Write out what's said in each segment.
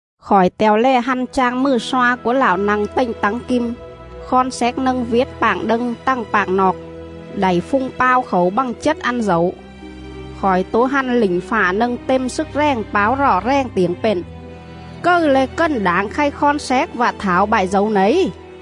Khỏi te̱o lè hăn chang mừ sloa cúa Lạo nă̱ng tềnh tắng kim khon xéc nâng viểt pạng đâng tằng pạng noọc, đảy phung pao khảu bă̱ng chết ăn dẩu.. Khỏi tố hăn lỉnh fạ nâng têm slức rèng páo rọ rèng tiểng pện: “Cầư le̱ cần đảng khay khon xéc vạ thảo bại dẩu nẩy?”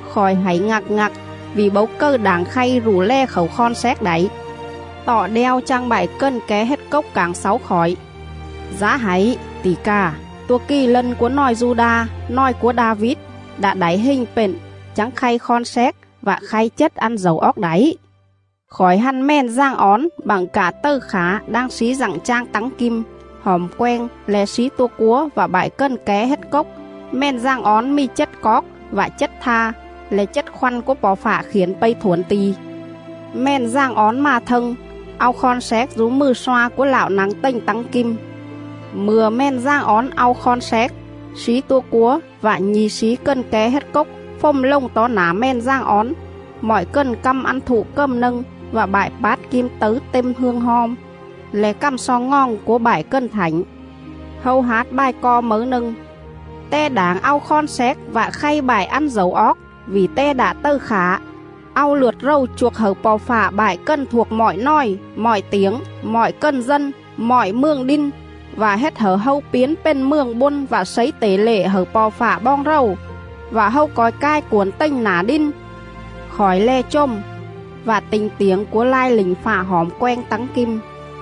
Khỏi hảy ngặc ngặc, vỉ bấu cầư đảng khay rụ lè khảu khon xéc đảy. Tọ đeo chang bại cần ké hết cốc cảng xáu khỏi: “Dá hảy, tỉ cà, tua Kì Lân cúa nòi Du-đa, nòi cúa Đa-vít, đạ đảy hình pện chắng khay khon xéc vạ khay chết ăn dẩu oóc đảy.”. Khỏi hăn Mèn Dàng Ón bặng cạ tầư khả đang slí dặng chang tắng kim, hỏm quenh le̱ slí tua cúa vạ bại cần ké hết cốc. Mèn Dàng Ón mì chết coóc vạ chết tha,. le̱ chết khoăn cúa Po̱ Fạ khiển pây thuổn ti̱. Mèn Dàng Ón mà thâng, au khon xéc dú mừ sloa cúa Lạo nă̱ng tềnh tắng kim. Mư̱a Mèn Dàng Ón au khon xéc, slí tua cúa vạ nhi̱ slí cần ké hết cốc fồm lồng tó nả Mèn Dàng Ón; mọi cần căm ăn thụ cầm nâng vạ bại pát kim tấư têm hương hom, le̱ cằm xo ngoòng cúa bại cần thảnh.. Hâu hát bài co mấư nâng:. “Te đảng au khon xéc Vạ khay bại ăn dẩu oóc, vỉ Te đạ tầư khả, Au lượt rầu chuôc hẩư Po̱ Fạ Bại cần thuộc mọi nòi, mọi tiểng, mọi cần dân, mọi mường đin, Vạ hết hẩư hâu piến pền Mường Bôn vạ slấy tể lệ hẩư Po̱ Fạ boong rầu,. Vạ hâu co̱i cai cuổn tềnh nả đin.” Khỏi lè chồm, vạ ti̱nh tiểng cúa lai lỉnh fạ hỏm quenh tắng kim,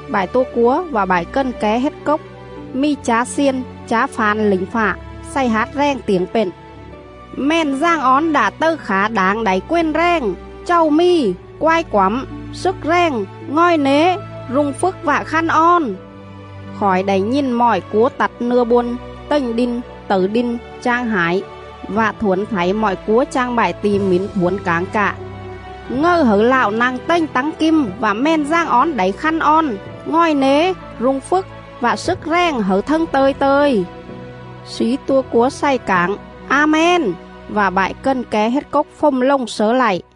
bại tua cúa vạ bại cần ké hết cốc. Mì chá xiên, chá fa̱n lỉnh fạ. xày hát rèng tiểng pện: “Mèn Dàng Ón đạ tầư khả Đảng đảy quền rèng, chàu mì, quai quẳm, Slức rèng, ngòi nế, rung phjức vạ khăn on!” Khỏi đảy nhìn mọi cúa tặt nưa bôn, tềnh đin, tẩư đin, chang hải, vạ thuổn thảy mọi cúa chang bại ti̱ mỉn thuổn cảng cạ: “Ngầư hẩư Lạo nă̱ng tềnh tắng kim vạ Mèn Dàng Ón Đảy khăn on, ngòi nế, rung phjức vạ slức rèng hẩư thâng tơ̱i tơ̱i!” Slí tua cúa xày cảng: “A-men!” Vạ bại cần ké hết cốc fồm lồng slớ lạy.